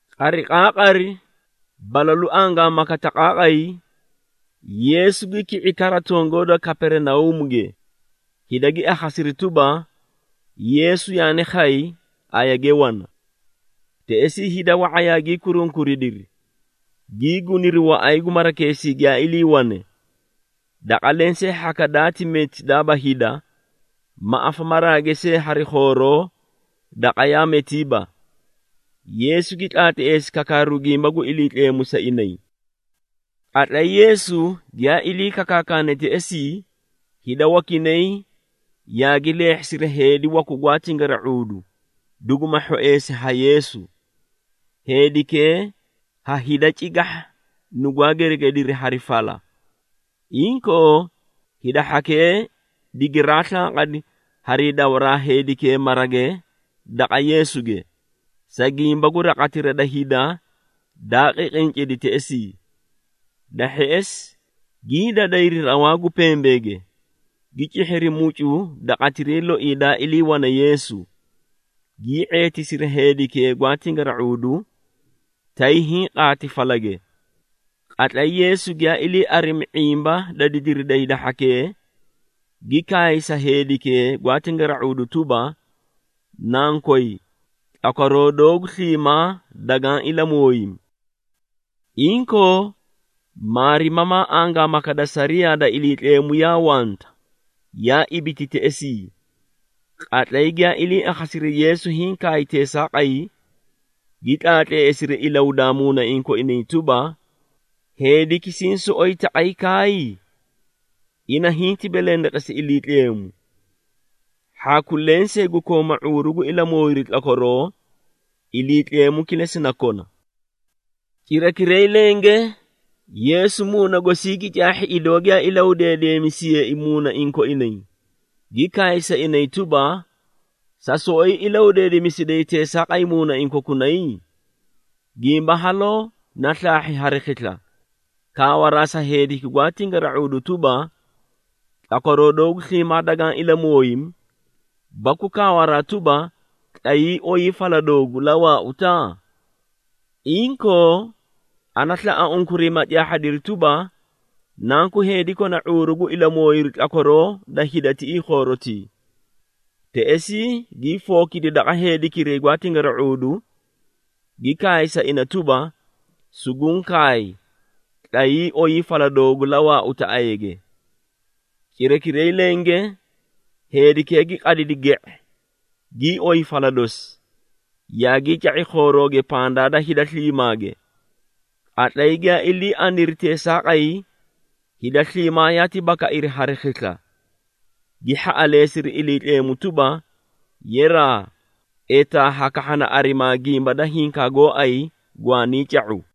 Qariqaaqari, balalu angaamaka taqaaqay, Yeesu gi ki⁄i kara tongoo da Kaperinauumuge, hida gi akhasiri tuba, Yeesu yaani khay, ayage wana. Teꞌesii hida wa⁄a yaagii kurunkuridiri, gii guniri waꞌay gu marakeesii giyaa iliiwane, daqa lensee hhaka daati meti daaba hida, ma afamaraage see hari khooroo daqa yaa metiiba. Yeesu gi tlaatleesi kakaaru gimba gu Iliitleemu sa inay. Qatlay Yeesu giyaa ilii kakaakane teꞌesii, hida wakinay yaagi leehhisiri heedi waku gwaa tingara⁄uudu, duguma hhoeesi ha Yeesu. Heedikee ha hida cigahha nugwaa geregediri hari fala. Inkoo, hida hhakee digiraa slanqadi hari dawaraa heedikee marage daqa Yeesuge, sa gimba gu raqatira da hida daa qiqincidi teꞌesii. Da hheꞌesi, gii dadayri rawaa gu pembeege, gi cihhiri mucu daqatiray loii daa iliiwane Yeesu, gii ⁄eetisiri heedikee gwaa tingara⁄uudu, tay hiĩ qaati falage. Qatlay Yeesu giyaa ilii arimi ⁄imba da didiri da hida hhakee, gi kaay sa heedikee gwaa tingara⁄uudu tuba, “Nankoy, tlakwaroo doogu sliimaa dagaã ilamooyimi!” Inkoo, maarimamaa angaamaka da sariyaa da Iliitleemu yaa wanta, yaa ibiti teꞌesii. Qatlay giyaa ilii akhasiri Yeesu hiĩ kaay teesaaqay, gi tlaatleesiri ilahudaa muunaiĩ koinay tuba, “Heediki siĩ soꞌoyi taqay kaay? Ina hinti belendeqesi Iliitleemu! Hhaku lensee gu kooma ⁄uuru gu ilamooyiru tlakwaroo, Iliitleemu kilesi na kona!” Cirakiray lenge Yeesu muuna gosii gi caahhi idoo giyaa ilahudeedemisiyeei muunaiĩ koinay, gi kaay sa inay tuba, “Sa soꞌoyi ilahudeedemisiday teesaaqay muunaiĩ kokunay? Gimba haloo na slaahhi hari khisla, kaawaraa sa heediki gwaa tingara⁄uudu tuba, ‘Tlakwaroo doogu sliimaa dagaã ilamooyimi,’ baku kaawaraa tuba, ‘Tlayii, oyii fala doogu, la waauta?’ Inkoo, ana slaꞌa unkuray, ma caahhadiri tuba, Nanku Heedi kona ⁄uuru gu ilamooyiru tlakwaroo da hida tiꞌii khoorotii!” Teꞌesii gii fookidi daqa heedikiray gwaa tingara⁄uudu, gi kaay sa ina tuba, “Suguũ kaay, tlayii, oyii fala doogu, la waauta ayage!” Cirakiray lenge, heedikee gi qadidi ge⁄e, gii oyi fala dosi, yaagii ca⁄i khoorooge pandaa da hida sliimaage. Qatlay giyaa ilii aniri teesaaqay, hida sliimaa yaati bakairi hari khisla, gi hhaꞌaleesiri Iliitleemu tuba, “Yeraa, etaa hakahhana arimaa gimba da hinkaa gooay gwaanii ca⁄u!”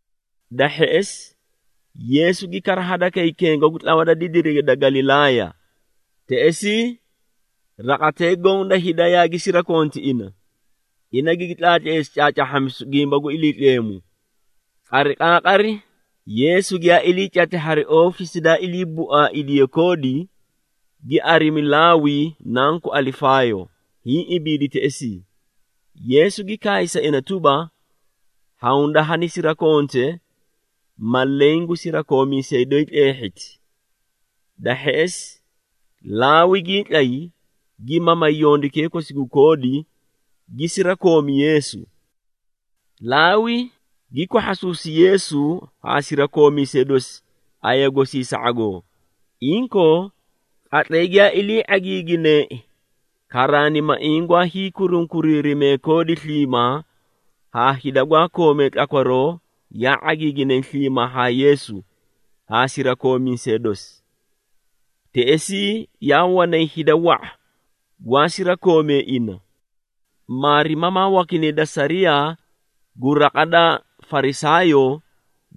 Da hheꞌesi, Yeesu gi kara hadakay kenga gu tlawa da didirige da Galilaaya. Teꞌesii raqatee goõ da hida yaagi sirakonti ina, ina gigi tlaatleesi caacaahhamisu gimba gu Iliitleemu. Qariqaaqari, Yeesu giyaa ilii cati hari oofisi daa ilii buaaidiye koodi, gi arimi Laawi nanku Alifaayo, hiĩ ibiidi teꞌesii. Yeesu gi kaay sa ina tuba, “Hawunda hanisirakonte, ma leẽ gu sirakoomiisee doyi tleehhiti!” Da hheꞌesi, Laawi gii tlay, gi mamay yondukee kosi gu koodi, gi sirakoomi Yeesu. Laawi gi kwahhasuusi Yeesu haa sirakoomiisee dosi aya gosii sa ⁄agoo. Inkoo, qatlay giyaa ilii ⁄agiigineei, karaanimaiĩ gwaa hiikurunkuriirimee koodi sliimaa haa hida gwaa koomee tlakwaroo yaa ⁄agiiginay sliimaa haa Yeesu haa sirakoomiisee dosi. Teꞌesii yaa wanay hida wa⁄a gwaa sirakoomee ina. Maarimamaa wakinay da sariyaa gu raqa da Farisaayoo,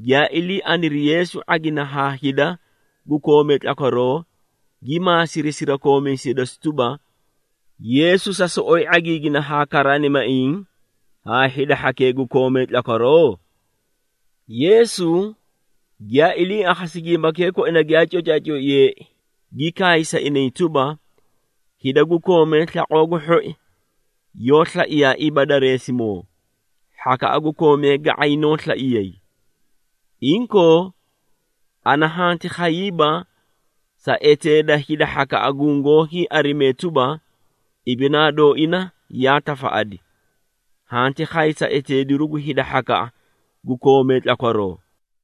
giyaa ilii aniri Yeesu ⁄agina haa hida gu koomee tlakwaroo, gi maasiri sirakoomiisee dosi tuba, “Yeesu sa soꞌoyi ⁄agiigina haa karaanimaiĩ haa hida hhakee gu koomee tlakwaroo?” Yeesu giyaa ilii akhasi gimbakee koina giyaa cocaacoiyeei, gi kaay sa inay tuba, “Hida gu koomee slaqoo gu hhoi yoó slaiyaaiiba dareesimoo, hhakaꞌa gu koomee ga⁄ay noó slaiyay. Inkoo, ana hanti khayiiba sa eteeda hida hhakaꞌa gungoó hiiarimee tuba, ibinaa dooina yaa tafaꞌadi, hanti khay sa eteediru gu hida hhakaꞌa gu koomee tlakwaroo.”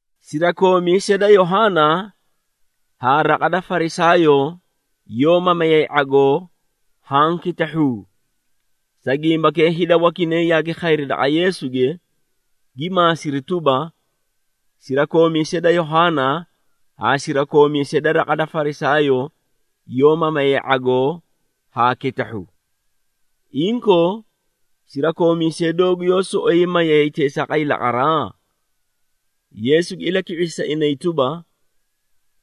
Sirakoomiisee da Yohaana haa raqa da Farisaayoo yoó mamayay ⁄agoo haã kitahhuu. Sa gimbakee hida wakinay yaagi khayri daqa Yeesuge, gi maasiri tuba, “Sirakoomiisee da Yohaana haa sirakoomiisee da raqa da Farisaayoo yoó mamayay ⁄agoo haa kitahhu. Inkoo, sirakoomiisee doogu yoó soꞌoyi mayay teesaaqay laqaraa?” Yeesu gi ilaki⁄isi sa inay tuba,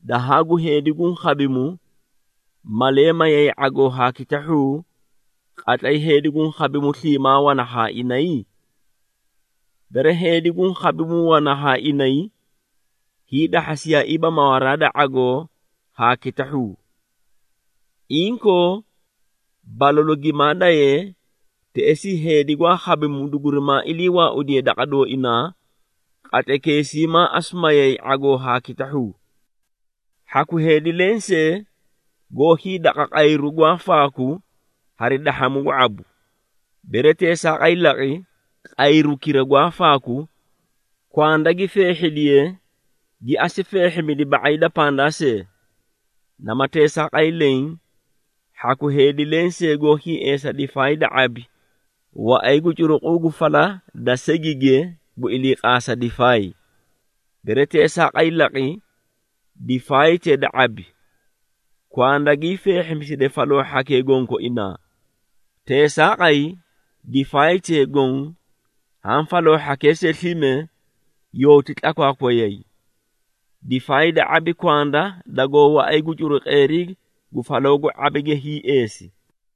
“Dahaa gu heedi guũ khabimu, malee mayay ⁄agoo haa kitahhuu qatlay heedi guũ khabimu, sliimaa wana haa inay? Bere heedi guũ khabimu wana haa inay, hiidahhasiyaaiiba mawaraa da ⁄agoo haa kitahhuu. Inkoo, balalu gimaa dayee, teꞌesii heedi gwaa khabimu dugurimaa ilii waaudiye daqa dooinaa, qatlaykeesii maa asu mayay ⁄agoo haa kitahhuu. Hhaku heedi lensee goó hiidaqa qayru gwaa faaku hari dahhamu gu ⁄abu. Bere teesaaqay laqi, qayrukira gwaa faaku, kwanda gi feehhidiye, gi asu feehhimidi ba⁄ay da pandaa see. Nama teesaaqay leẽ, hhaku heedi lensee goó hiieesa difaay da ⁄abi waꞌay gu curuquu gu fala da segige gu iliiqaasa difaay. Bere teesaaqay laqi, difaaytee da ⁄abi, kwanda gii feehhimiside faloo hhakee gonkoinaa. Teesaaqay difaaytee goõ haã faloo hhakee see slime yooti tlakwaakwayay. Difaay da ⁄abi kwanda dagoó waꞌay gu curuqeerii gu faloo gu ⁄abige hiieesi.”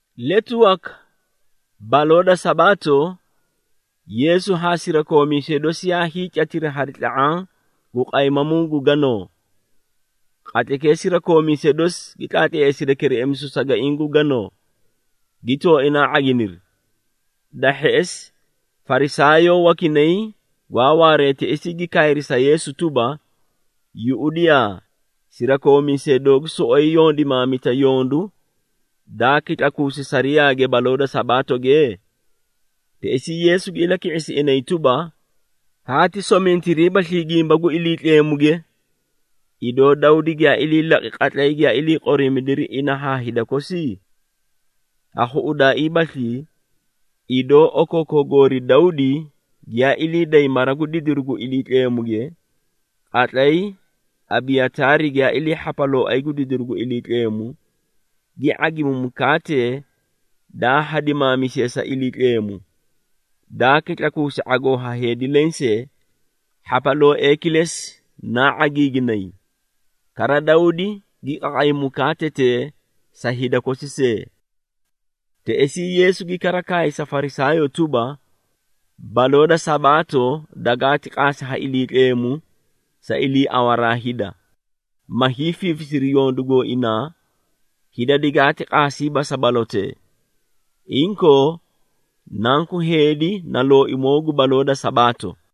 Letu waka baloo da Sabaato, Yeesu haa sirakoomiisee dosi yaa hiicatiri hari tla⁄aã gu qaymamuu gu ganoo. Qatlaykee sirakoomiisee dosi gi tlaatleesidi kereꞌemisu sagaiĩ gu ganoo, gi tooinaa ⁄aginiri. Da hheꞌesi Farisaayoo wakinay gwaa waaree teꞌesii gi kaayri sa Yeesu tuba, “Yuꞌudiyaa, sirakoomiisee doogu soꞌoyi yondimaamita yondu daa kitlakuusi sariyaage baloo da Sabaatoge?” Teꞌesii Yeesu gi ilaki⁄isi inay tuba, “Haati somintiriibaslii gimba gu Iliitleemuge, idoo Dawdi giyaa ilii laqi qatlay giyaa ilii qoriimidiri ina haa hida kosi? Ha khuꞌudaaiibaslii, idoo okookoo goori Dawdi giyaa ilii day mara gu didiru gu Iliitleemuge, qatlay Abiyataari giyaa ilii hhapalooay gu didiru gu Iliitleemu, gi ⁄agimi mukaatee daa hadimaamisiye sa Iliitleemu, daa kitlakuusi ⁄agoo ha heedi lensee, hhapalooee kilesi naa ⁄agiiginay. Kara Dawdi gi qaqay mukaatetee sa hida kosi see!” Teꞌesii Yeesu gi kara kaay sa Farisaayoo tuba, “Baloo da Sabaato dagaati qaasi ha Iliitleemu sa iliiawaraa hida, ma hiifiifisiri yondu gooinaa, hida digaati qaasiiba sa balotee. Inkoo, Nanku Heedi na Looimoo gu baloo da Sabaato.”